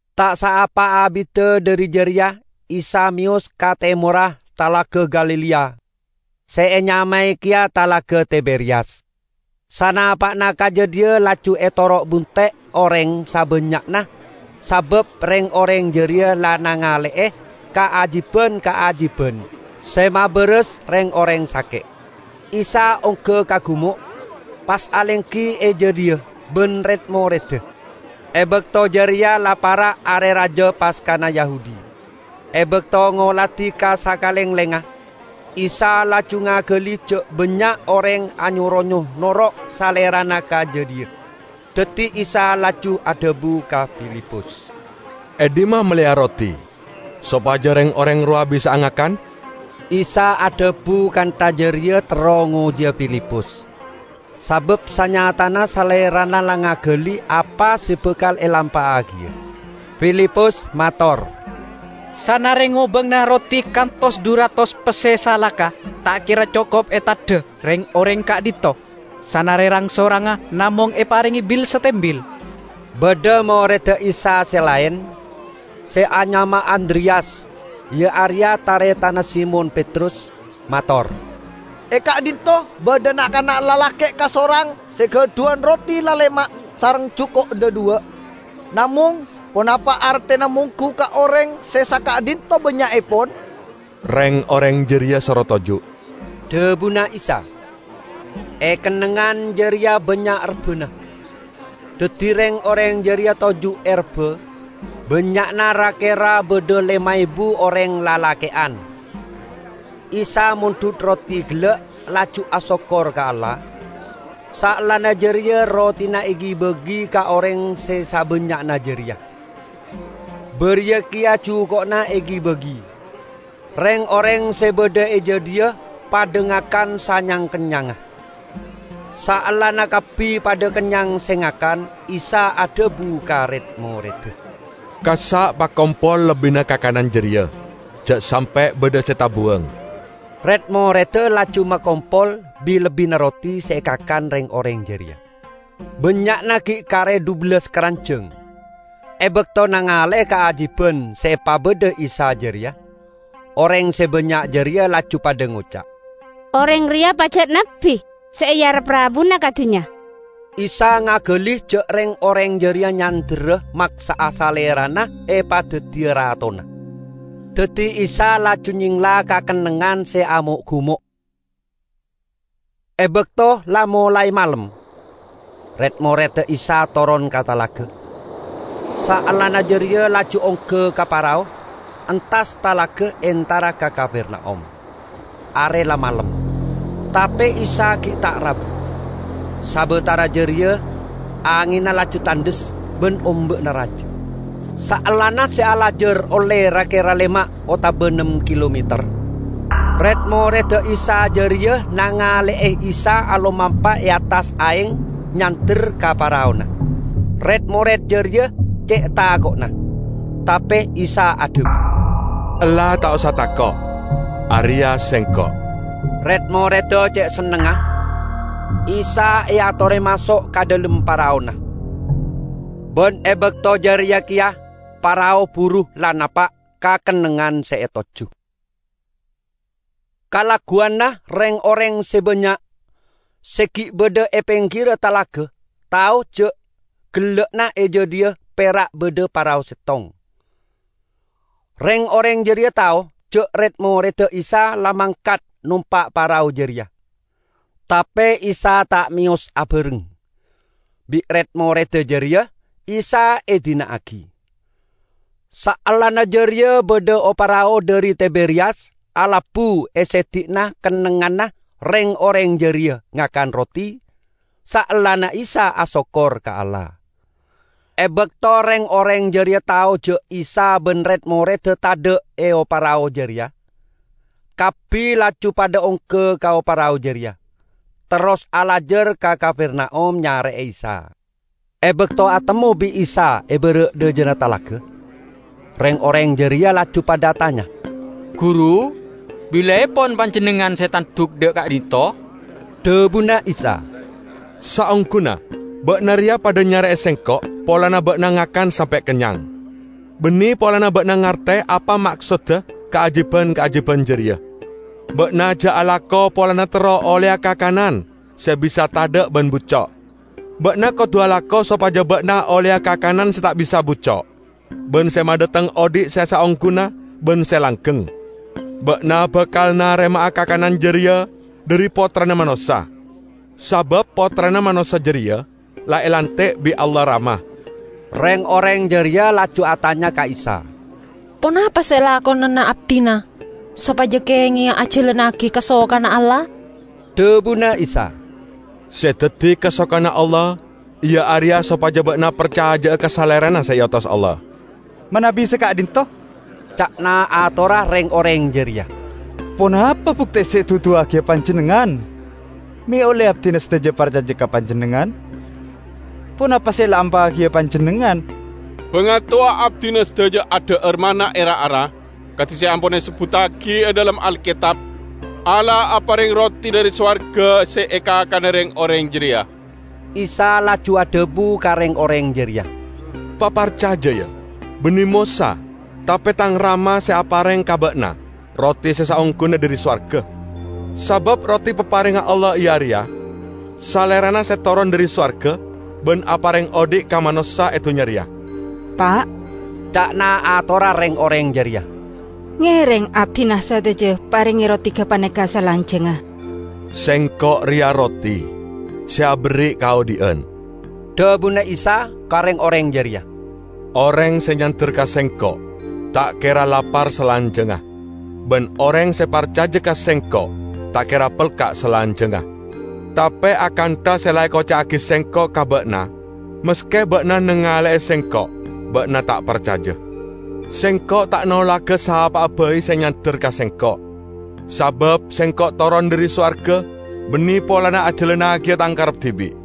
Ta' saapa abidda dhari jareya Isa meyos ka temorra Talaga Galilea, se enyamae keya Talaga Tiberiyas. Sanapa'na ka jadhiya laju etoro' bunte' oreng sabannya'na sabab reng-oreng jareya la nangale'e kaajiban-kaajiban se mabaras reng-oreng sake'. Isa ongga ka gumo', pas alenggi e jadhiya ban red-moredda. E bakto jareya la para' Are Raja Paskana Yahudi. E bakto ngoladi ka sakalenglengnga, Isa laju ngagali ja' bannya' oreng anyo-ronyo noro' Salerana ka jadhiya. Daddi Isa laju adhabu ka Filipus, "E dhimma melleya roti, sopaja reng-oreng rowa bisa'a ngakan?" ( Isa adhabu kantha jareya terro ngojiya Filipus, sabab sanyatana Salerana la ngagali apa se bakal elampa'agiya.) Filipus mator, "Sanare ngobangana roti kantos dhu ratos pesse salaka ta' kera cokop eteddha reng-oreng ka'dhinto', sanare rang-sorangnga namong eparenge bil-satembil." Badha moredda Isa se laen, se anyama Andreyas, iya areya taretanna Simon Petrus, mator, "E ka'dhinto' badha na'-kana' lalake' kasorang se gadhuwan roti lalema' sareng juko' dhadhuwa'. Namong ponapa artena monggu ka oreng se saka'dhinto bannya'epon." "Reng-oreng jareya soro toju'," dhabuna Isa. E kennengngan jareya bannya' rebbana, daddi reng-oreng jareya toju' e rebba, bannya'na ra-kera badha lema ebu oreng lalake'an. Isa mondhut roti gella', laju asokkor ka Allah. Saellana jareya rotina egi-bagi ka oreng se sabannya'na jareya. Bariya keya juko'na egi-bagi. Reng-oreng se badha e jadhiya padha ngakan sanyang-kennyangnga. Saellana kabbi padha kennyang se ngakan, Isa adhabu ka red-moredda, "Kassa' pakompol lebbina kakanan jareya; ja' sampe' badha se tabuwang." Red-moredda laju makompol bin-lebbinna roti se ekakan reng-oreng jareya, bannya'na gi' kare dhubellas karanjang. E bakto nangale'e kaajiban se epabadha Isa jareya, oreng se bannya' jareya laju padha ngoca', "Oreng reya pajat Nabbi se earep rabuna ka dunnya!" Isa ngagali ja' reng-oreng jareya nyanderra maksa'a Salerana epadaddiya ratona. Daddi Isa laju nyengla ka kennengngan se amo'-gumo'. E bakto la molae malem, red-moredda Isa toron ka talaga. Saellana jareya laju ongga ka parao, entas talaga entara ka Kapernaum. Are la malem, tape Isa gi' ta' rabu. Sabatara jareya angenna laju tandhes ban omba'na raja. Saellana se alajar olle ra-kera lema' otaba nem kilometer, red-moredda Isa jareya nangale'e Isa alomampa e attas aeng nyander ka paraona. Red-mored jareya ce' tako'na. Tape Isa adhabu, "Ella, ta' osa tako', areya Sengko'!" Red-moredda ce' sennengnga, Isa eatore maso' ka dhalem paraona, ban e bakto jareya keya parao buru la napa' ka kennengngan se etojju. Kalagguwanna reng-oreng se bannya' se gi' badha e penggirra talaga tao ja' gella'na e jadhiya pera' badha parao settong. Reng-oreng jareya tao ja' red-moredda Isa la mangkat nompa' parao jareya, tape Isa ta' meyos abareng. Bi' red-moredda jareya Isa edina'agi. Saellana jareya badha o-parao dhari Tiberiyas alabbu e seddi'na kennengnganna reng-oreng jareya ngakan roti saellana Isa asokkor ka Allah. E bakto reng-oreng jareya tao ja' Isa ban red-moredda tadha' e o-parao jareya, kabbi laju padha ongga ka o-parao jareya, terros alajar ka Kapernaum nyare'e Isa. E bakto atemmo bi' Isa e bara' dhajana talaga, reng-oreng jareya laju padha atanya, "Guru, bilaepon Panjennengngan se tanduk dha' ka'dhinto'?" Dhabuna Isa, "Saongguna, ba'na reya padha nyare'e Sengko' polana ba'na ngakan sampe' kennyang, banne polana ba'na ngarte apa maksodda kaajiban-kaajiban jareya. Ba'na ja' alako polana terro olleya kakanan se bisa tadha' ban bucco'. Ba'na kodu alako sopaja ba'na olleya kakanan se ta' bisa bucco' ban se madhateng odhi' se saongguna ban se langgeng. Ba'na bakal narema'a kakanan jareya dhari Pottrana Manossa, sabab Pottrana Manossa jareya la elanti' bi' Allah Rama." Reng-oreng jareya laju atanya ka Isa, "Ponapa se elakonana abdina sopaja kengenga ajalannagi kasokanna Allah?" Dhabuna Isa, "Se daddi kasokanna Allah iya areya sopaja ba'na parcaja'a ka Salerana se eotos Allah." "Manabi saka'dhinto," ca'na atorra reng-oreng jareya, "ponapa bukte se eduduwagiya Panjennengngan me' olle abdina sadaja parcaja ka Panjennengngan? Ponapa se elampa'agiya Panjennengngan? Bangatowa abdina sadaja adha'ar manna e ra-ara, kadi se ampon esebbuttagi e dhalem Alketab, 'Allah apareng roti dhari sowarga se ekakana reng-oreng jareya.' " Isa laju adhabu ka reng-oreng jareya, "Paparcaja, ya: Banne Mosa, tape Tang Rama se apareng ka ba'na roti se saongguna dhari sowarga. Sabab roti paparengnga Allah iya areya Salerana se toron dhari sowarga ban apareng odhi' ka manossa e dunnya reya." "Pa'," ca'na atorra reng-oreng jareya, "ngereng abdina sadaja parenge roti gapaneka salanjangnga." "Sengko' reya Roti se aberri' kaodhi'an," dhabuna Isa ka reng-oreng jareya. "Oreng se nyander ka Sengko' ta' kera lapar salanjangnga. Ban oreng se parcaja ka Sengko' ta' kera pelka' salanjangnga." "Tape akantha se la ekoca'agi Sengko' ka ba'na, maske ba'na nangale'e Sengko', ba'na ta' parcaja. Sengko' ta' nolaga sapa'a bai se nyander ka Sengko'. Sabab Sengko' toron dhari sowarga, banne polana ajalannagiya Tang karep dibi',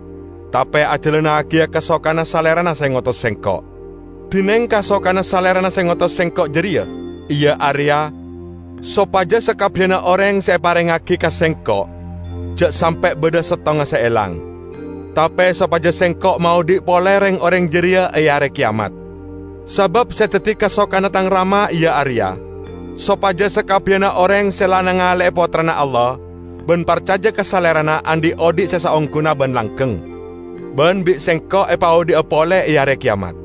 tape ajalannagiya kasokanna Salerana se ngotos Sengko'. Dineng kasokanna Salerana se ngotos Sengko' jareya iya areya: sopaja sakabbiyanna oreng se eparengngagi ka Sengko' ja' sampe' badha settonga se elang; tape sopaja Sengko' maodhi' pole reng-oreng jareya e Are Keyamat. Sabab se daddi kasokanna Tang Rama iya areya: Sopaja sakabbiyanna oreng se la nangale'e Pottrana Allah ban parcaja ka Salerana andhi' odhi' se saongguna ban langgeng. Ban bi' Sengko' epaodhi'a pole e Are Keyamat."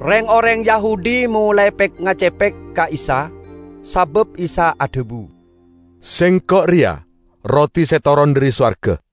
Reng-oreng Yahudi molae pek-ngacepek ka Isa, sabab Isa adhabu: "Sengko' reya roti se toron dhari sowarga".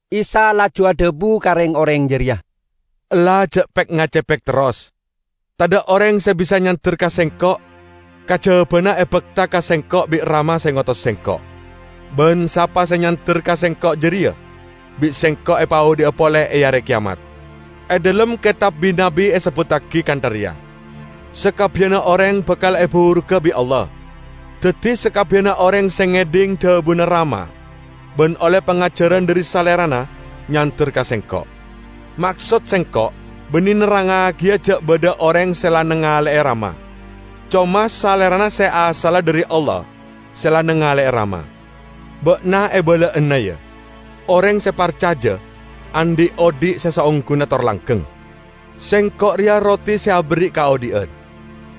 Isa laju adhabu ka reng-oreng jareya, "Ella ja' pek-ngacepek terros. Tadha' oreng se bisa nyander ka Sengko', kajabana ebakta ka Sengko' bi' Rama se ngotos Sengko'; ban sapa se nyander ka Sengko' jareya bi' Sengko' epaodhi'a pole e Are Keyamat. E dhalem Ketab Bi-nabbi esebbuttagi kantha reya, 'Sakabbiyanna oreng bakal eburuga bi' Allah.' Daddi sakabbiyanna oreng se ngedhing dhabuna Rama ban olle pangajaran dhari Salerana, nyander ka Sengko'. Maksod Sengko' banne nerrangngagiya ja' badha oreng se la nangale'e Rama. Coma Salerana se asalla dhari Allah se la nangale'e Rama. Ba'na ebala'ana, ya: Oreng se parcaja, andhi' odhi' se saongguna tor langgeng. Sengko' reya roti se aberri' kaodhi'an.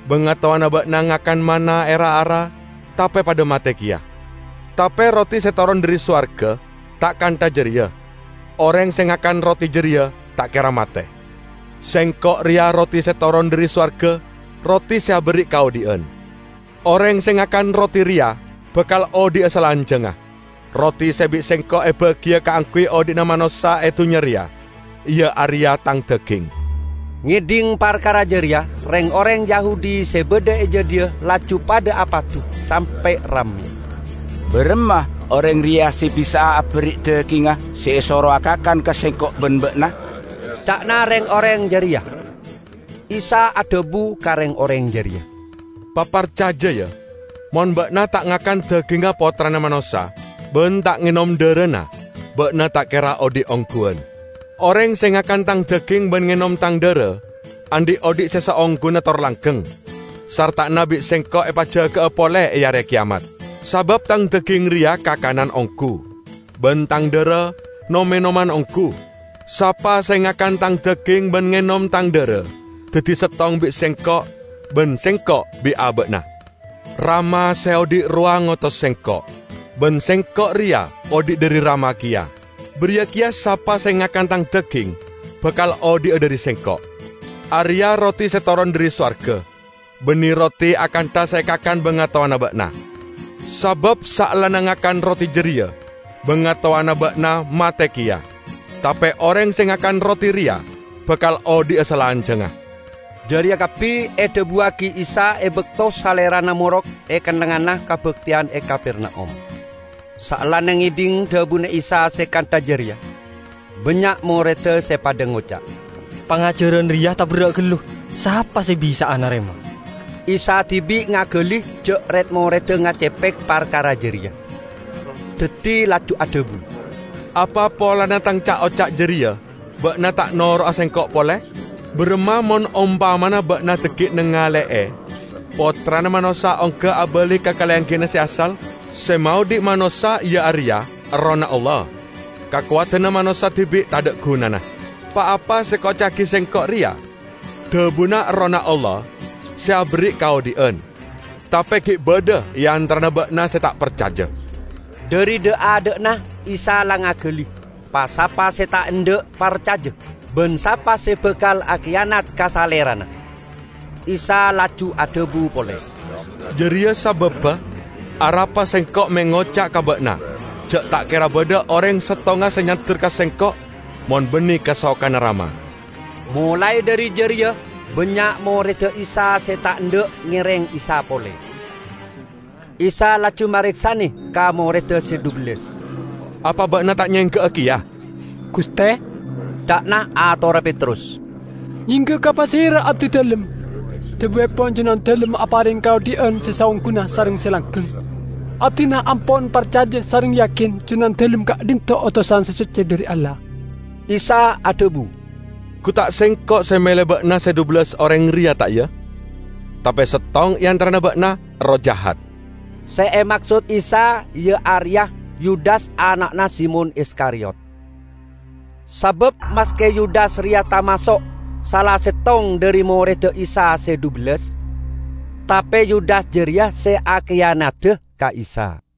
Bangatowana ba'na ngakan manna e ra-ara tape padha mate keya. Tape roti se toron dhari sowarga ta' kantha jareya; oreng se ngakan roti jareya ta' kera mate. Sengko' reya roti se toron dhari sowarga -- roti se aberri' kaodhi'an. Oreng se ngakan roti reya bakal odhi'a salanjangnga. Roti se bi' Sengko' ebagiya kaangguy odhi'na manossa e dunnya reya iya areya Tang daging." Ngedhing parkara jareya, reng-oreng Yahudi se badha e jadhiya laju padha apadu sampe' ramme. "Baramma oreng reya se bisa'a aberri' dagingnga se esorowa kakan ka sengko' ban ba'na?" ca'na reng-oreng jareya. Isa adhabu ka reng-oreng jareya, "Paparcaja, ya. Mon ba'na ta' ngakan dagingnga Pottrana Manossa ban ta' ngenom dharana, ba'na ta' kera odhi' ongguwan. Oreng se ngakan Tang daging ban ngenom Tang dhara, andhi' odhi' se saongguna tor langgeng; sarta'anna bi' Sengko' epajaga'a pole e Are Keyamat. Sabab Tang daging reya kakanan onggu ban Tang dhara nom-enoman onggu. Sapa se ngakan Tang daging ban ngenom Tang dhara daddi settong bi' Sengko', ban Sengko' bi' aba'na. Rama se odhi' rowa ngotos Sengko', ban Sengko' reya odhi' dhari Rama keya. Bariya keya sapa se ngakan Tang daging bakal odhi'a dhari Sengko'. Areya' roti se toron dhari sowarga: banne roti akantha se ekakan bangatowana ba'na. Sabab saellana ngakan roti jareya bangatowana ba'na mate keya. Tape oreng se ngakan roti reya bakal odhi'a salanjangnga." Jareya kabbi edhabuwagi Isa e bakto Salerana morok e kennengnganna kabakteyan e Kapernaum. Saellana ngedhing dhabuna Isa se kantha jareya, bannya' moredda se padha ngoca', "Pangajaran reya taberra' gallu. Sapa se bisa'a narema!" Isa dibi' ngagali ja' red-moredda ngacepek parkara jareya. Daddi laju adhabu, "Apa polana Tang ca'-oca' jareya ba'na ta' noro'a Sengko' pole? Baramma mon ompamana ba'na dhaggi' nangale'e Pottrana Manossa ongga abali ka kalenggiyanna se asal? Se maodhi' manossa iya areya Errohna Allah. Kakowadanna manossa dibi' tadha' gunana. Pa-apa se ekoca'agi Sengko' reya dhabuna Errohna Allah se aberri' kaodhi'an. Tape gi' badha e antarana ba'na se ta' parcaja." (Dhari dha'-adha'na Isa la ngagali pa-sapa se ta' endha' parcaja ban sapa se bakal akiyanat ka Salerana.) Isa laju adhabu pole, "Jareya sababba arapa Sengko' me' ngoca' ka ba'na ja' ta' kera badha oreng settonga se nyander ka Sengko' mon banne kasokanna Rama." Molae dhari jareya bannya' moredda Isa se ta' endha' ngereng Isa pole. Isa laju mareksane ka moredda se dhubellas, "Apa ba'na ta' nyengga'a keya?" "Guste," ca'na atorra Petrus, "Nyengga'a ka pasera abdidalem? Dhabuepon Junandalem apareng kaodhi'an se saongguna sareng se langgeng. Abdina ampon parcaja sareng yakin Junandalem ka'dhinto' otosan se socce dhari Allah." Isa adhabu, "Gu ta' Sengko' se mele ba'na se dhubellas oreng reya, ta' iya? Tape settong e antarana ba'na erroh jahat!" Se emaksod Isa iya areya Yudas ana'na Simon Iskariyot. Sabab maske Yudas reya tamaso' sala settong dhari moredda Isa se dhubellas, tape Yudas jareya se akiyanada ka Isa.